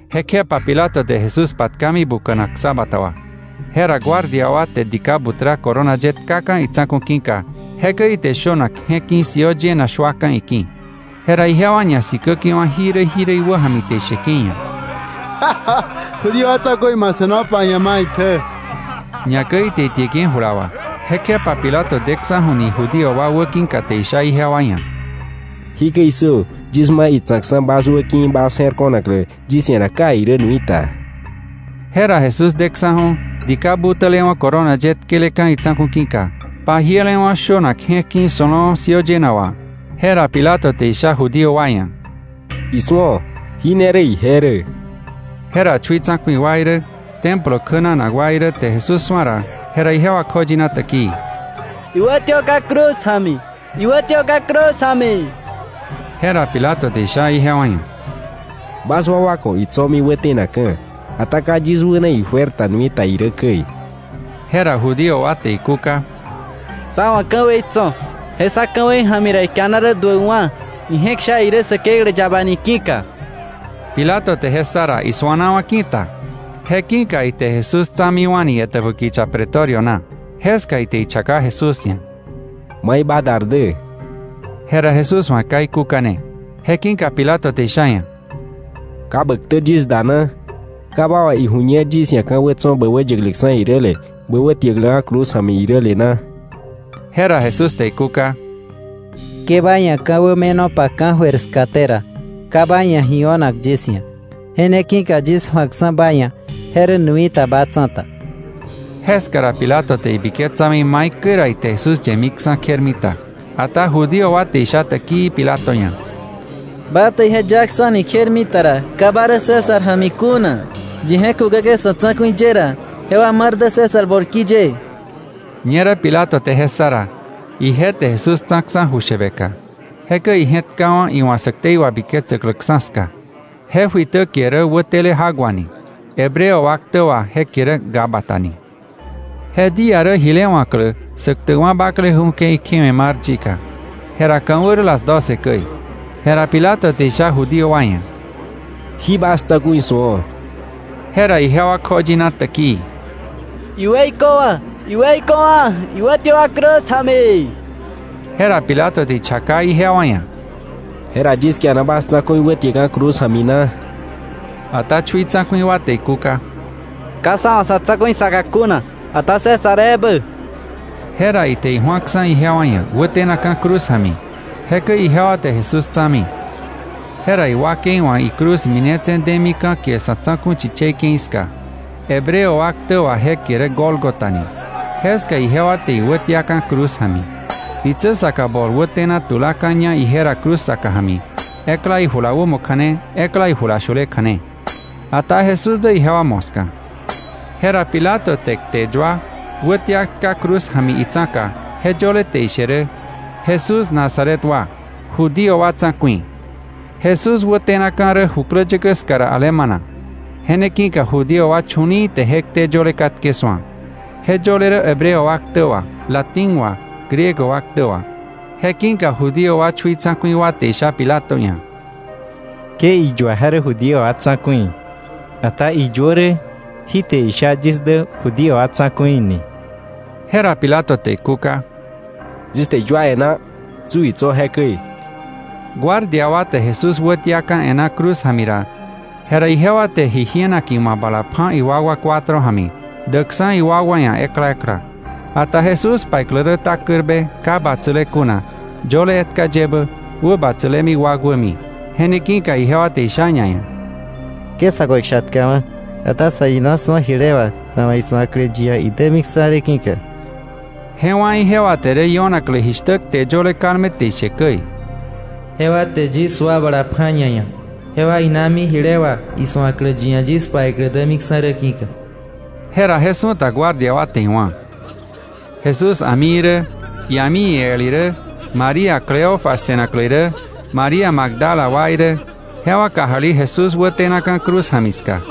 Jekjepa Pilato te Jesús patkami buka̱nak ksabata wà. Jera guardia wa te dika butra corona ye tkaka̱ itsa̱ku̱ ki̱ka, jekäi ite shönak je̱k ki̱ siöö yëna shuaka̱ iki̱. Jera ijewa ñasikäke̱wa̱ jirä jirä iwäja̱mi te isheke̱ iia̱: —Judío wa tsa̱ku̱i, ma se̱nopa ji̱a maitjä. Ñakäi ite itieke̱ jula wà. Jekjepa Pilato deksa̱ju̱ni Judío wa wäki̱ka te isha ijewa ia̱: —¡Jikäi issö! Yis ma itsa̱kksa̱ bas wäki̱ bas je̱r ko̱naklä yis ia̱ ra ka irä nui ta. Jera Jesús deksa̱ju̱ dika butälewa̱ corona ye tkeleka̱ itsa̱ku̱ ki̱ka, pajielewa̱ shönak je̱k ki̱ so̱lo̱o̱ siöö yëna wà. Jera Pilato te isha Judío wa ia̱: —Isu̱o, jí ne rä ije rä. Jera chui tsa̱ku̱i wa irä, Templo kjänanak wa irä, te Jesús su̱a ra, jera ijewa kjoyina täkii: —¡Iwätiöka̱ cruz ja̱mi! ¡Iwätiöka̱ cruz ja̱mi! Jera Pilato te isha ijewa ia̱: —Bas wakwa ku̱ itso̱mi wätenakka̱. Ata ka yis wäna ijuer ta nui ta irä käi. Jera Judío wa te ikúka: —Sá wa̱ ka̱wei tso̱, je sá ka̱wei ja̱mi ra ikiana duäkwa̱, ije̱k sha irä Säkeklä yaba ni ki̱ka. Pilato te je ssa ra, isuanawa̱ ki̱ta. Je ki̱ka ite Jesús tsa̱miwa̱ni etäbä kicha Pretorio na. Jeska ite ichaka Jesús ia̱: —¿Mai ba dar dä? Jera Jesús wa̱ ka ikúkane. Je ki̱ka Pilato te isha iia̱: —¿Ka bä ktä yis da na? ¿Ka ba wa̱ iju̱ñer yis ia̱ ka̱wä tso̱ bä yäkläksa̱ iräle, bä wätiäkläka̱ cruz ja̱mi iräle na? Jera Jesús te ikúka: —Ke ba ia̱ ka̱wä me̱nopa ka̱jöir skaté ra, ka ba ia̱ ji o̱nak yis ia̱. Je ne ki̱ka yis ju̱akksa̱ ba ia̱, je rä nui ta ba tsa̱ta. Jeska ra Pilato te ibiketsami maikäi ra ite Jesús yemiksa̱ kjermita. Ata Judío wa te isha täkii Pilato ia̱: —¡Ba te ije yaksa̱ni kjermita ra, ka ba rä César ja̱mi kuna! ¡Yi je̱k kukäke̱ sa̱ tsa̱ku̱i ye ra, jewa mar dä César bolki ye! Ñerä Pilato te je ssa ra, ije te Jesús tsa̱ksa̱ ju shäbeka. Jekäi ije̱tkawa̱ iwa̱ sä ktei wabiketsäkläksa̱ ska. Je juitä kie rä Wätele Jak Wa ni. Hebreo wa ktä wà je kie rä Gábata ni. Je día rä jile wa̱klä Säktäkwa̱ Bakleju̱ ke̱i kjewe̱ mar yika. Jera ka̱wä rä las doce käi. Jera Pilato te isha Judío wa ia̱: —¡Jí bas tsa̱ku̱i su̱o! Jera ijewa kjoyina täkii: —¡Iweiköwa̱! ¡Iweiköwa̱! ¡Iwätiöka̱ cruz ja̱mi! Jera Pilato te ichaka ijewa ia̱: —¿Jera yis kiana bas tsa̱ku̱i wätiäkka̱ cruz ja̱mi na? Ata chui tsa̱ku̱i wa te ikúka: —Ka sá wa̱ sa̱ tsa̱ku̱i saka kuna, ata César ebä. Jera ite iju̱aksa̱ ijewa ia̱ wätenakka̱ cruz ja̱mi. Jekäi ijewa te Jesús tsa̱mi. Jera iwakei wa̱ icruz minetse̱ demi ka̱ kie Sa̱tsa̱ku̱ Chichei Ke̱i ska, (Hebreo wa ktä wà je kie rä Gólgota ni). Jeska ijewa te iwätiaka̱ cruz ja̱mi. Ditsä saka bol wätena tulaka̱ña ije ra cruz saka ja̱mi, ekla ijula wämo kja̱ne, ekla ijula shule kja̱ne. Ata Jesús dä ijewa moska. Jera Pilato te kte yua wätia tka cruz ja̱mi itsa̱ka, je yöle te ishe rä: “Jesús Nazaret wa, Judío wa Tsa̱ku̱i.” Jesús wätenaka̱ rä jukläyäkä ska ra alemana. Je ne ki̱ka Judío wa chu̱li̱i̱ te je kte yöle katke su̱a. Je yöle rä Hebreo wa ktä wà, Latín wà, Griego wa ktä wà. Je ki̱ka Judío wa chui tsa̱ku̱i wa te isha Pilato ia̱: —Ke iyua: ‘Je rä Judío wa tsa̱ku̱i’, ata iyuö rä: ‘Jí te isha yis dä Judío wa tsa̱ku̱i’ ni. Jera Pilato te ikúka: —Yis te iyua e̱ná, tsu itso̱ jekäi. Guardia wa te Jesús wätiaka̱ e̱ná cruz ja̱mi ra, jera ijewa te ji jienak iwa̱ bala pja̱ iwakwa cuatro ja̱mi, däkksa̱ iwakwa ia̱ ekla ekla. Ata Jesús paiklä rä takärbe ka batsäle kuna, yöle etka yebä, wäbatsälemi wakwämi. Je ne ki̱ka ijewa te isha ñaia̱: —Ke sa̱ ku̱ ikshatkawa̱; ata sa̱ ina su̱o jile wà sa̱ wa̱ isu̱aklä yi ia̱ idämiksa̱ rä ki̱ka. Je wá̱ ijewa te rä io̱naklä jishtä kte yöle kalme te ishe käi: “Jewa te yis sua bala pja̱ ñaia̱. Jewa inami jile wà isu̱aklä yi ia̱ yis paiklä dämiksa̱ rä ki̱ka.” Jera je su̱ta guardia wa te iwá̱. Jesús a̱mi irä, ia̱mi el irä, María Cleofas se̱naklä irä, María Magdala wa irä, jewa kajali Jesús wätenaka̱ cruz ja̱mi ska.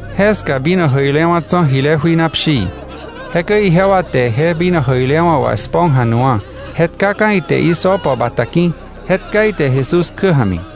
Jeska uva diä jäi tso̱ jile jui na pshii. Jekäi ijewa te je uva diä jäi wà esponja nu̱wa̱, je tkaka̱ ite hisopo bata ki̱, je tka ite Jesús kjä ja̱mi.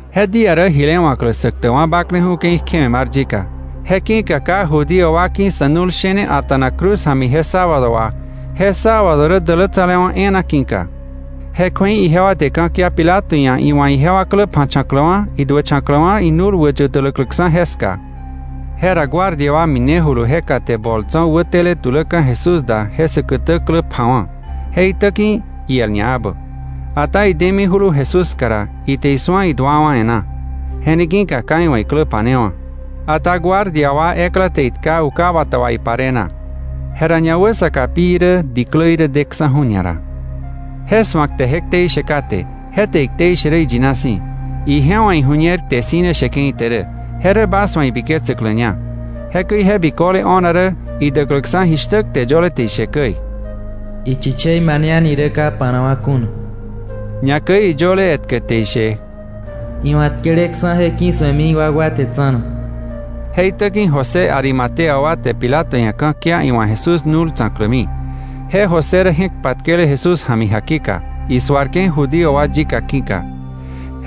Je día rä jile wa̱klä Säktäkwa̱ Bakleju̱ ke̱i kjewe̱ mar yika, je ki̱ka ka Judío wa ki̱ sä nu̱l shene a̱ta̱nak cruz ja̱mi je sábado wà, (je sábado rä dälätsalewa̱ e̱e̱na ki̱ka) ijewa te ka̱kia Pilato ia̱ iwa̱ ijewa klä pja̱cha̱kläwa̱ iduächa̱kläwa̱ nu̱l wäyä tuläkläksa̱ jeska. Jera guardia wa minejulu jeka te bol tso̱ wäteletuläka̱ Jesús da je säkätä klä pja̱wa̱, je itä ki̱ iel ñaebä. Ata idemijulu Jesús ska ra, ite isu̱a iduawa̱ e̱ná. Je ne ki̱ka ka iwa̱ iklä pa̱newa̱. Ata guardia wa ekla te itka uka bata wà ipare na. Jera ñawäsaka pi irä diklä irä deksa̱ju̱ ñara. Je su̱ak te je ktei she kate. Je te iktei she rä iyina si̱. Ije wa̱ iju̱ñer kte si̱ ne sheke̱ ite rä. Je rä bas wa̱ ibiketsäkläña. Jekäi je biköle o̱na rä idäkläksa̱ jishtä kte yöle te ishe käi: “Ichichei mane a̱ni rä ka pa̱nakwa̱ kuna.” Ñakäi iyöle etkä te ishe: “Iwa̱ tkeleksa̱ je ki̱su̱emi iwakwa te tsa̱na.” Je itä ki̱ José Arimatea wa te Pilato ia̱ ka̱kia iwa̱ Jesús nu̱l tsa̱klämi. Je José rä je̱k patkele Jesús ja̱mi jakika, isuarke̱ Judío wa yika ki̱ka.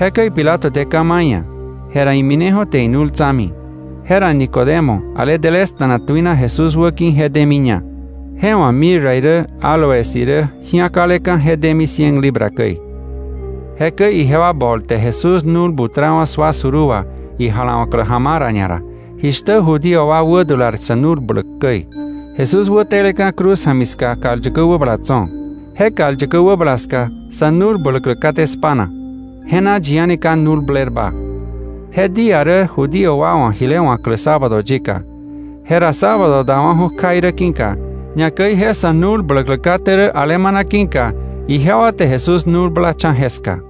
Jekäi Pilato te ka̱ ma̱ iia̱, jera imineju̱ te inu̱l tsa̱mi. Jera Nicodemo, ale delesta̱na tuina Jesús wäki̱ je demiña. Je wa̱ mirra irä áloes irä ji̱akaleka̱ je demi cien libra käi. Jekäi ijewa bol te Jesús nu̱l butrawa̱ sua suruu wà ijalawa̱klä ja̱ma̱a̱ ra ñara, jishtä Judío wa wädular sa̱ nu̱l bläk käi. Jesús wäteleka̱ cruz ja̱mi ska kal yäkä wäbala tso̱. Je kal yäkä wäbala ska sa̱ nu̱l bläklä kate spa̱na, je na yi a̱ni ka nu̱l blerba. Je día rä Judío wa wa̱ jile wa̱klä sábado yika. Jera sábado dawa̱ju̱ kja irä ki̱ka, ñakäi je sa̱ nu̱l bläklä kate rä alemana ki̱ka, ijewa te Jesús nu̱l blacha̱ jeska.